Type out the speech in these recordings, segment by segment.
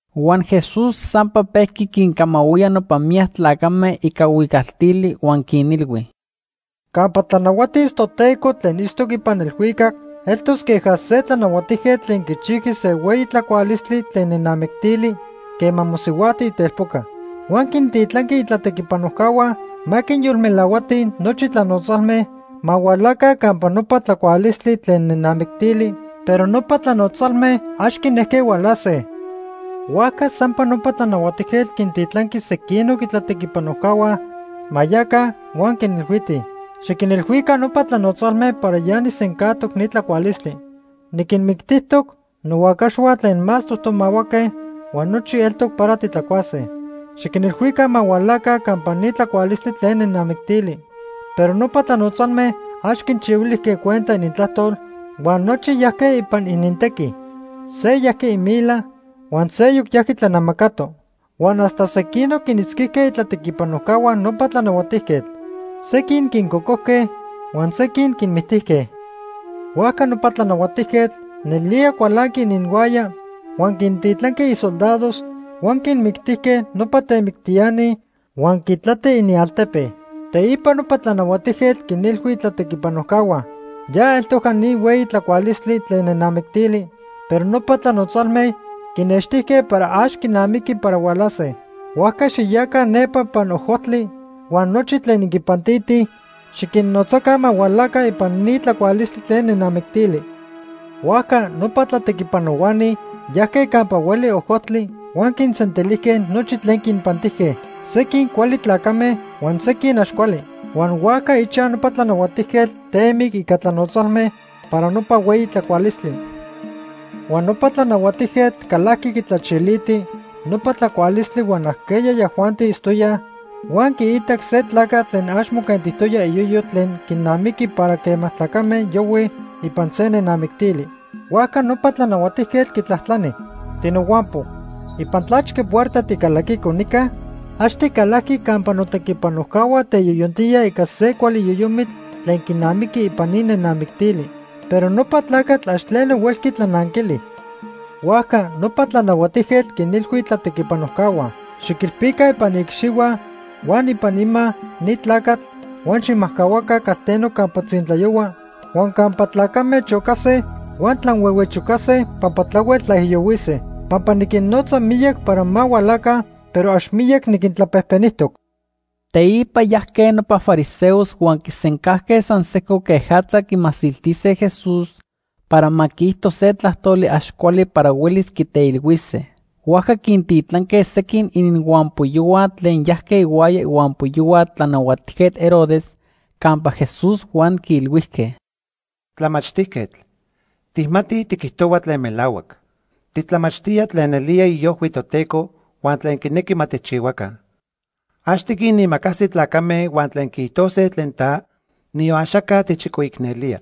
Huan Jesús sampa pejqui quincamahuía nopa miyac tlacame ica huicaltili huan quinilhui: “Campa tlanahuatis Toteco tlen itztoc ipan elhuicac, eltos queja se tlanahuatijquetl tlen quichijqui se hueyi tlacualistli tlen nenamictili quema mosihuajti itelpoca. Huan quintitlanqui itlatequipanojcahua ma quinyolmelahuatij nochi tlanotzalme ma hualaca campa nopa tlacualistli tlen nenamictili, pero nopa tlanotzalme ax quinejque hualase. “Huajca sampa nopa tlanahuatijquetl quintitlanqui sequinoc itlatequipanojcahua ma yaca huan quinilhuitij: ‘Xiquinilhuica nopa tlanotzalme para ya nijsencajtoc ni tlacualistli. Niquinmictijtoc nohuacaxhua tlen más tomahuaque huan nochi eltoc para titlacuase. Xiquinilhuica ma hualaca campa ni tlacualistli tlen nenamictili.’ Pero nopa tlanotzalme ax quinchihuilijque cuenta inintlajtol huan nochi yajque ipan inintequi. Se yajqui imila huan seyoc yajqui tlanamacato. Huan hasta sequinoc quinitzquijque itlatequipanojcahua nopa tlanahuatijquetl. Sequin quincocojque huan sequin quinmictijque. Huajca nopa tlanahuatijquetl nelía cualanqui ininhuaya huan quintitlanqui isoldados huan quinmictijque nopa temictiani huan quitlati inialtepe. “Teipa nopa tlanahuatijquetl quinilhui itlatequipanojcahua: ‘Ya eltojca ni hueyi tlacualistli tlen nenamictili, pero nopa tlanotzalme quinextijque para ax quinamiqui para hualase. Huajca xiyaca nepa ipan ojojtli huan nochi tlen inquinpantitij, xiquinnotzaca ma hualaca ipan ni tlacualistli tlen nenamictili.’ Huajca nopa tlatequipanohuani yajque campa hueli ojojtli huan quinsentilijque nochi tlen quinpantijque, sequin cuali tlacame huan sequin ax cuali. Huan huajca ichaj nopa tlanahuatijquetl temic ica tlanotzalme para nopa hueyi tlacualistli. “Huan nopa tlanahuatijquetl calajqui quitlachiliti nopa tlacualistli huan ajqueya yajuanti itztoyaj, huan quiitac se tlacatl tlen ax moquentijtoya iyoyo tlen quinamiqui para quema tlacame yohuij ipan se nenamictili. Huajca nopa tlanahuatijquetl quitlajtlani: ‘Tinohuampo, ¿ipan tlachque puerta ticalaquico nica? Ax ticalajqui campa notequipanojcahua teyoyontíaj ica se cuali yoyomitl tlen quinamiqui ipan ni nenamictili.’ Pero nopa tlacatl ax tleno huelqui tlananquili. Huajca nopa tlanahuatijquetl quinilhui itlatequipanojcahua: ‘Xiquilpica ipan iicxihua huan ipan ima ni tlacatl huan xijmajcahuaca calteno campa tzintlayohua huan campa tlacame chocase huan tlanhuehuechocase pampa tlahuel tlaijiyohuise.’ Pampa niquinnotza miyac para ma hualaca, pero ax miyac niquintlapejpenijtoc.” Teipa yajque nopa fariseos huan quisencajque san sejco quejatza quimasiltise Jesús para ma quiijto se tlajtoli ax cuali para huelis quiteilhuise. Huajca quintitlanque sequin ininhuampoyohua tlen yajque ihuaya ihuampoyohua Tlanahuatijquetl Herodes campa Jesús huan quiilhuijque: ―Tlamachtijquetl, tijmatij tiquijtohua tlen melahuac. Titlamachtía tlen nelía iojhui Toteco huan tlen quinequi ma tijchihuaca. Ax tiquinimacasi tlacame huan tlen quiijtose tlen ta, niyon axaca tijchicoicnelía.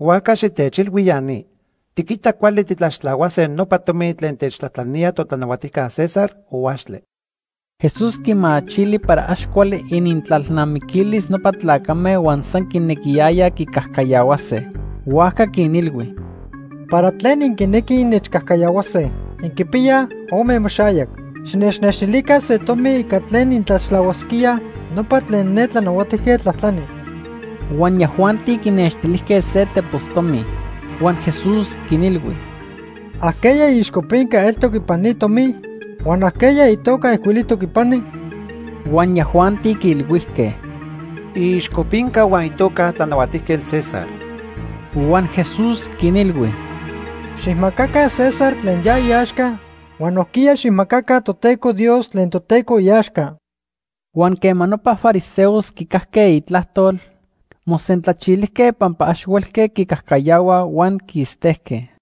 Huajca xitechilhui ya ni. ¿Tiquita cuali titlaxtlahuase nopa tomi tlen techtlajtlanía totlanahuatijca César, o axtle? Jesús quimachili para ax cuali inintlalnamiquilis nopa tlacame huan san quinequiyayaj quicajcayahuase. Huajca quinilhui: ―¿Para tlen inquinequij innechcajcayahuase? Inquipiyaj ome imoxayac. Xinechnextilica se tomi ica tlen intlaxtlahuasquíaj nopa tlen ne tlanahuatijquetl tlajtlani. Huan yajuanti quinextilijque se tepos tomi. Huan Jesús quinilhui: ―¿Ajqueya iixcopinca eltoc ipan ni tomi? Huan ¿ajqueya itoca ijcuilijtoc ipani? Huan yajuanti quiilhuijque: ―Iixcopinca huan itoca tlanahuatijquetl César. Huan Jesús quinilhui: ―Xijmacaca César tlen ya iaxca huan nojquiya xijmacaca Toteco Dios tlen Toteco iaxca. Huan quema nopa fariseos quicajque itlajtol, mosentlachilijque pampa ax huelque quicajcayahuaj huan quistejque.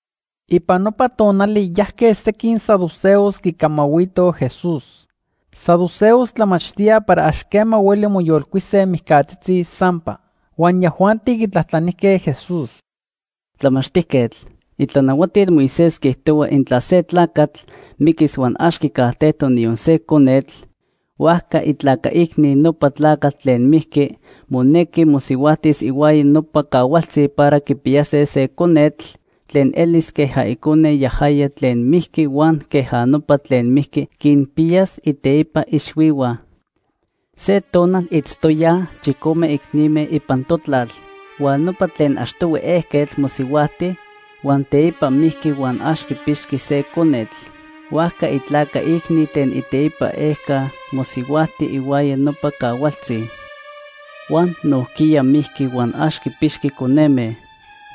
Ipan nopa tonali yajque sequin saduceos quicamahuitoj Jesús. Saduceos tlamachtíaj para ax quema hueli moyolcuise mijcatzitzi sampa. Huan yajuanti quitlajtlanijque Jesús: ―Tlamachtijquetl, itlanahuatil Moisés quiijtohua intla se tlacatl miquis huan ax quicajtejtoc niyon se conetl, huajca itlaca icni nopa tlacatl tlen mijqui monequi mosihuajtis ihuaya nopa cahualtzi para quipiyase se conetl tlen elis queja icone yajaya tlen mijqui huan queja nopa tlen mijqui quinpiyas iteipa ixhuihua. Se tonal itztoyaj chicome icnime ipan totlal, huan nopa tlen achtohui ejquetl mosihuajti, huan teipa mijqui huan ax quipixqui se conetl. Huajca itlaca icni tlen iteipa ejca mosihuajti ihuaya nopa cahualtzi. Huan nojquiya mijqui huan ax quipixqui coneme.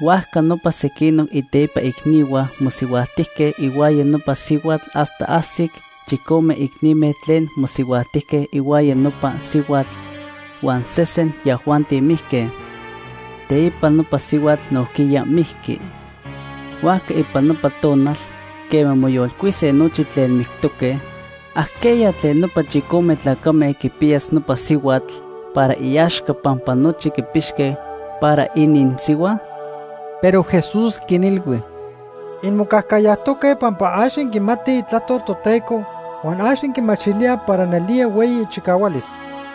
Huajca nopa sequinoc iteipa icnihua mosihuajtijque ihuaya nopa sihuatl hasta ajsic chicome icnime tlen mosihuajtijque ihuaya nopa sihuatl, huan sesen yajuanti mijque. Teipa nopa sihuatl nojquiya mijqui. Huajca ipan nopa tonal quema moyolcuise nochi tlen mictoque, ¿ajqueya tlen nopa chicome tlacame quipiyas nopa sihuatl para iaxca pampa nochi quipixque para ininsihua? Pero Jesús quinilhui: ―Inmocajcayajtoque pampa ax inquimatij Itlajtol Toteco huan ax inquimachilíaj para nelía hueyi ichicahualis.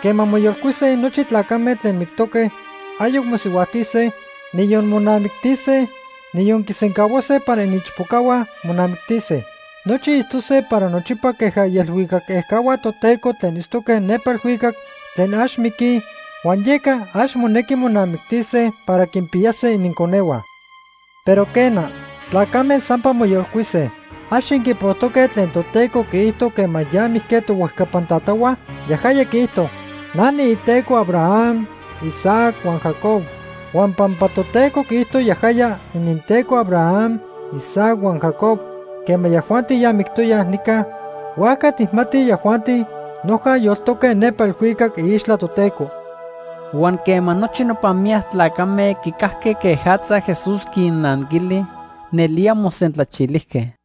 Quema moyolcuise nochi tlacame tlen mictoque, ayoc mosihuajtise, niyon monamictise, niyon quisencahuase para iniichpocahua monamictise. Nochi itztose para nochipa queja ielhuicac ejcahua Toteco tlen itztoque nepa elhuicac tlen ax miquij huan yeca ax monequi monamictise para quinpiyase ininconehua. Pero quena, tlacame sampa moyolcuise. ¿Ax inquipojtoque tlen Toteco quiijto quema ya mijque tohuejcapan tatahua? Yajaya quiijto: ‘Na niiTeco Abraham, Isaac huan Jacob.’ Huan pampa Toteco quiijto yajaya ininTeco Abraham, Isaac huan Jacob quema yajuanti ya mictoyaj nica, huajca tijmatij yajuanti noja yoltoque nepa elhuicac iixtla Toteco. Huan quema nochi nopa miyac tlacame quicajque quejatza Jesús quinnanquili, nelía mosentlachilijque.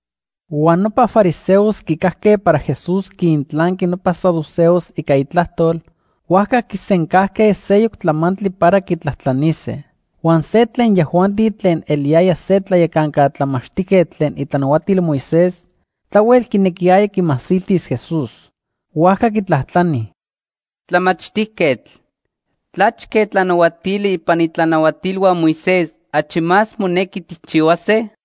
Huan nopa fariseos quicajque para Jesús quintlanqui nopa saduceos ica itlajtol, huajca quisencajque seyoc tlamantli para quitlajtlanise. Huan se tlen yajuanti tlen eliyaya se tlayacanca tlamachtijquetl tlen itlanahuatil Moisés tlahuel quinequiyaya quimasiltis Jesús. Huajca quitlajtlani: ―Tlamachtijquetl, ¿tlachque tlanahuatili ipan itlanahuatilhua Moisés achi más monequi tijchihuase?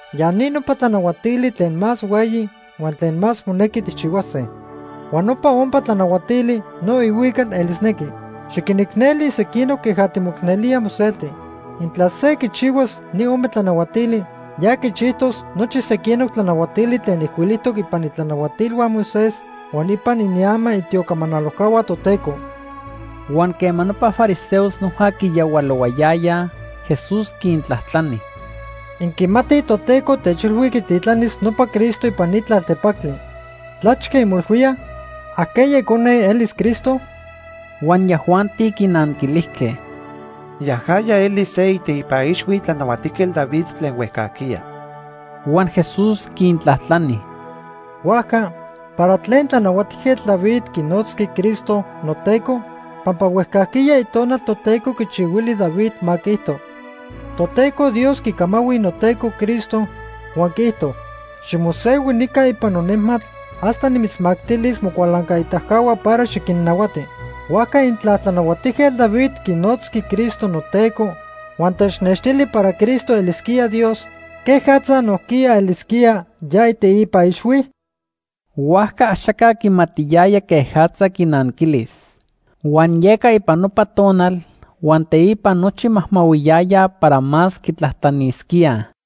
Ya ni nopa tlanahuatili tlen más hueyi huan tlen más monequi tijchihuase. Huan nopa ompa tlanahuatili no ihuical elisnequi: ‘Xiquinicneli sequinoc queja timoicnelía moselti.’ Intla se quichihuas ni ome tlanahuatili, ya quichijtos nochi sequinoc tlanahuatili tlen ijcuilijtoc ipan itlanahuatilhua Moisés huan ipan iniama itiocamanalojcahua Toteco. Huan quema nopa fariseos noja quiyahualohuayaya, Jesús quintlajtlani: ―Inquimatij Toteco techilhui quititlanis nopa Cristo ipan ni tlaltepactli. ¿Tlachque inmoilhuíaj? ¿Ajqueya icone elis Cristo? Huan yajuanti quinanquilijque: ―Yajaya elis se iteipa ixhui Tlanahuatijquetl David tlen huejcajquiya. Huan Jesús quintlajtlani: ―Huajca, ¿para tlen Tlanahuatijquetl David quinotzqui Cristo ‘noTeco’? Pampa huejcajquiya Itonal Toteco quichihuili David ma quiijto: ‘Toteco Dios quicamahui noTeco Cristo, huan quiijto: Ximosehui nica ipan nonejmatl hasta nimitzmactilis mocualancaitacahua para xiquinnahuati.’ Huajca intla Tlanahuatijquetl David quinotzqui Cristo ‘noTeco’ huan technextili para Cristo elisquía Dios, ¿quejatza nojquiya elisquía ya iteipa ixhui? Huajca axaca quimatiyaya quejatza quinanquilis. Huan yeca ipan nopa tonal huan teipa nochi majmahuiyayaj para más quitlajtlanisquíaj.